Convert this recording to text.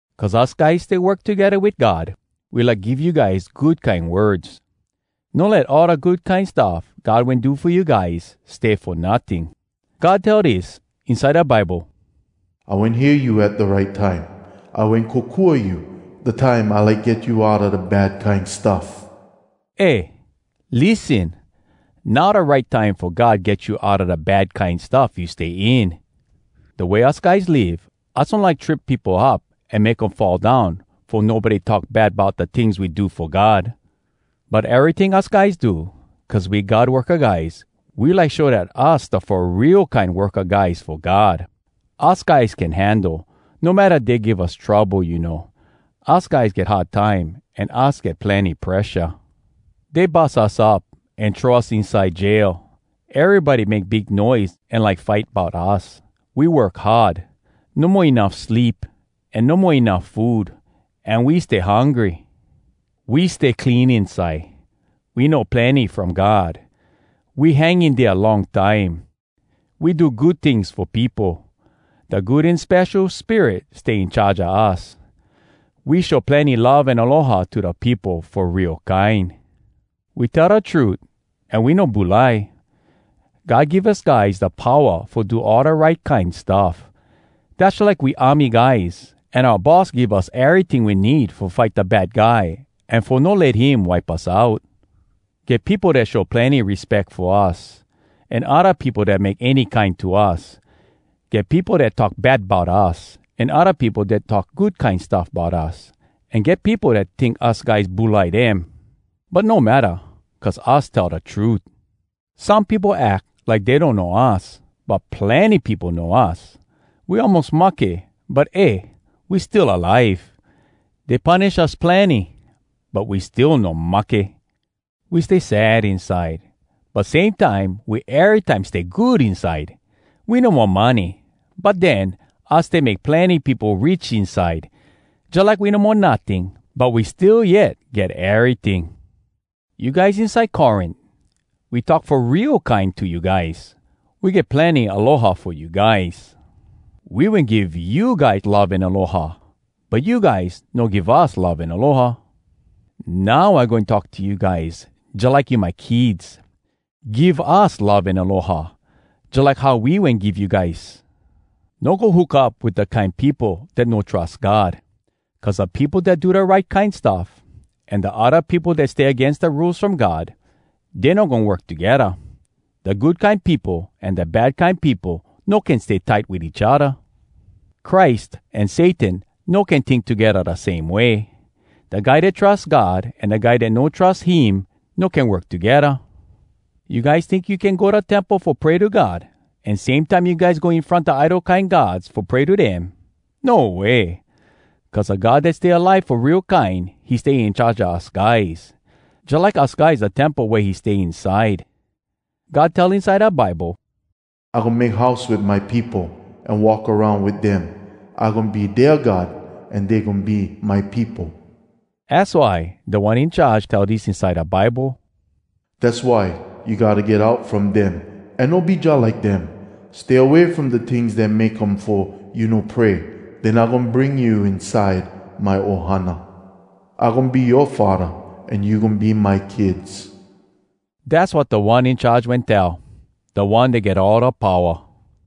Cuz us guys stay work togedda wit God, we like give you guys good kine words: No let all da good kine stuff God wen do fo you guys stay fo notting. God tell dis inside da Bible, “I wen hear you at da right time. I wen kokua you, da time I like get you outa da bad kine stuff.” Eh, lissen! Now da right time fo God get you outa da bad kine stuff you stay in! Da way us guys live, us no like trip peopo up an make um fall down fo nobody talk bad bout da tings we do fo God. But eryting us guys do, cuz we God worka guys, we like show dat us da fo real kine worka guys fo God. Us guys can handle, no matta dey give us trouble, you know. Us guys get hard time an us get plenny presha. Dey bus us up an throw us inside jail. Erybody make big noise an like fight bout us. We work hard. No mo enuff sleep, an no mo enuff food, an we stay hungry. We stay clean inside. We know plenny from God. We hang in dea long time. We do good tings fo peopo. Da Good An Spesho Spirit stay in charge a us. We show plenny love an aloha to da peopo fo real kine. We tell da trut an we no bulai. God give us guys da powa fo do all da right kine stuff. Dass jalike we army guys, an oua boss give us eryting we need fo fight da bad guy an fo no let him wipe us out. Get peopo dat show plenny respeck fo us, an odda peopo dat make any kine to us. Get peopo dat talk bad bout us, an odda peopo dat talk good kine stuff bout us. An get peopo dat tink us guys bulai dem, but no matta cuz us tell da trut! Some peopo ack like dey donno us, but plenny peopo know us. We almos mahke, but eh, we still alive! Dey punish us plenny, but we still no mahke. We stay sad inside, but same time we erytime stay good inside. We no mo money, but den, us stay make plenny peopo rich inside. Jalike we no mo notting, but we still yet get eryting. You guys inside Corint, we talk fo real kine to you guys. We get plenny aloha fo you guys. We wen give you guys love an aloha, but you guys no give us love an aloha. Now I goin talk to you guys jalike you my kids. Give us love an aloha, jalike how we wen give you guys. No go hook up wit da kine peopo dat no trus God. Cuz da peopo dat do da right kine stuff, an da odda peopo dat stay agains da Rules From God, dey no goin work togedda. Da good kine peopo an da bad kine peopo no can stay tight wit each odda. Christ an Satan no can tink togedda da same way. Da guy dat trus God an da guy dat no trus him no can work togedda. You guys tink you can go da temple fo pray to God, an same time you guys go in front da idol kine gods fo pray to dem? No way! Cuz da God dat stay alive fo real kine, he stay in charge a us guys, jalike us guys da temple wea he stay inside. God tell inside da Bible, “I goin make house wit my peopo An walk aroun wit dem. I goin be dea God An dey goin be my peopo.” Az why Da One In Charge tell dis inside da Bible, “Dass why you gotta get out from dem An no be jalike dem. Stay away from da tings dat make um fo you no pray. Den I goin bring you inside my ohana. I goin be yoa Faddah, An you goin be my kids.” Dass wat Da One In Charge wen tell, da One Dat Get All Da Powa.